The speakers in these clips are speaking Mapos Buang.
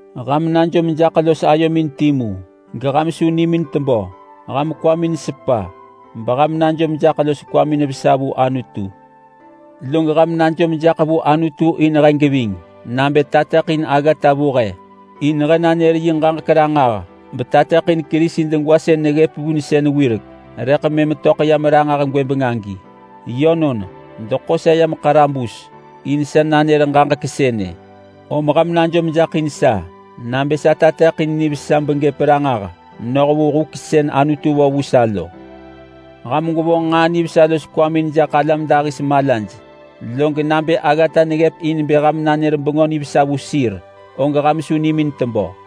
Ham najom jaḳ los ayomin timu, geham su nimin tebö. Ham kwamin sepa beham najom jaḳ los kwamin vesa vu Anutu. Log ham najom jaḳ vu Anutu in he geving nabë tateḳin aggata vu he, in he nanër yi ġaġek ranġah betateḳin Kerisi degwa sën neggëp vunsën wirek rëḳ mëm töḳ yam ranġah gwëbeng agi. Yönon, deḳo sa yam ḳarabus in sa nanër ġaġek sënë, om ham najom jaḳ in sa nabë sa tateḳin nivesa begëp ranġah noh vu huk sën Anutu vo vu sa lo. Ham gwevonġ nġaa nivesa los kwamin jaḳ alam dahis malaj, log nabë aggata neggëp in bë ham nanër Bengö Nivesa vu sir, og ham su nimin tebö.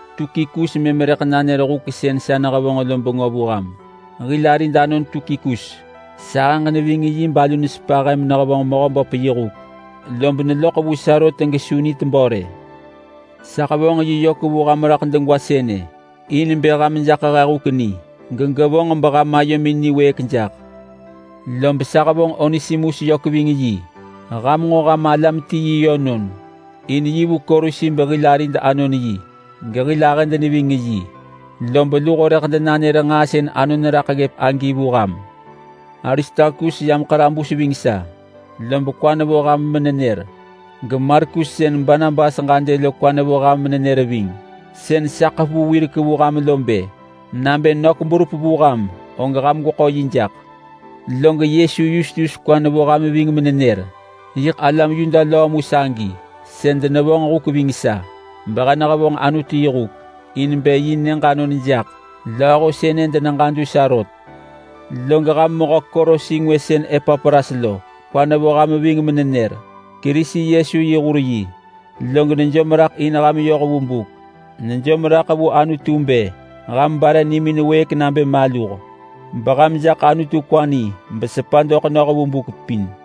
Tukikus mëm rëḳ nanër huk sën sa nehevonġ lo bengö vu ham. Hil arid anon Tukikus. Sahëġ neving yi balu nesepa he menehevonġ Mehöböp yi huk, lob neloḳ vu sa rot gesu nitebö rë. Sa hevonġ yi yök vu ham raḳ degwa sënë, in bë ham jaḳ he huk ni, gegevonġ beham ayomin niwëëk jaḳ. Lob sa hevonġ Onesimus yök ving yi. Ham nġo ham alam ti yi yönon, in yi vu Kolosi behil arid anon yi, gehil ahëd neving yi. Lob luho rëḳ denanër nġaa sën anon raḳ ggëp agi vu ham. Aristarkus yam ḳarabus ving sa, lob kwa nevo ham menenër. GeMarkus sën Barnabas ġadë lo kwa nevo ham menenër ving. Sën sa ḳevu wirek vu ham lo bë: Nabë nök berup vu ham, og ham gweḳo yi jaḳ. Log Yesu Yustus kwa nevo ham ving menenër. Yiḳ alam Yuda löö mu sagi sën denevonġ huk ving sa behe nehevonġ Anutu yi huk, in bë yi nyëġ anon jaḳ. Lööho sënë deneġadu sa rot. Log ham mehö Kolosi ngwë sën Epapras lo kwa nevo ham ving menenër. Kerisi Yesu yi hur yi, log nejom raḳ in ham yoh vu buk. Nejom raḳ vu Anutu bë ham bare nimin wëëk nabë maluh, beham jaḳ Anutu kwa ni, besepa doḳ noh vu buk pin.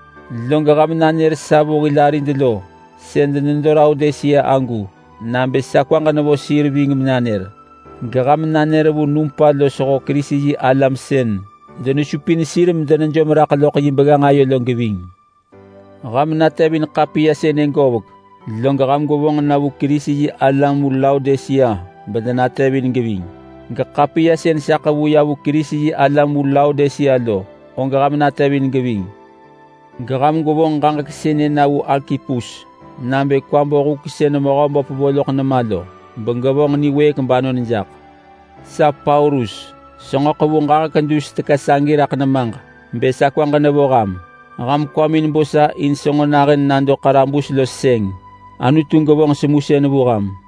Log ham nanër sa vu hil arid lo sën denedo Laodisea agu nabë sa kwaġ nevo sir ving menanër. Geham nanër vu Numpa losho Kerisi-yi-alam sën denesupin sir medenejom raḳ loḳ yi begganġ lo geving. Ham natevin ḳapiya sënë govek log ham gwevonġ na vu Kerisi-yi-alam vu Laodisea bedenatevin geving. Geḳapiya sën sa ḳevu ya vu Kerisi-yi-alam vu Laodisea lo, og ham natevin geving. Geham gwevonġ ġaġek sënë na vu Arkipus nabë kwa bo huk sën Mehöböp vo loḳ nema lo, begevonġ niwëëk banon jaḳ. Sa Paulus senġo ḳevu ġaġek dus teka sagi raḳ nemaġ bë sa kwaġ nevo ham. Ham kwamin bo sa in senġo nahën nado ḳarabus los sëng. Anutu gevonġ semusën vu ham.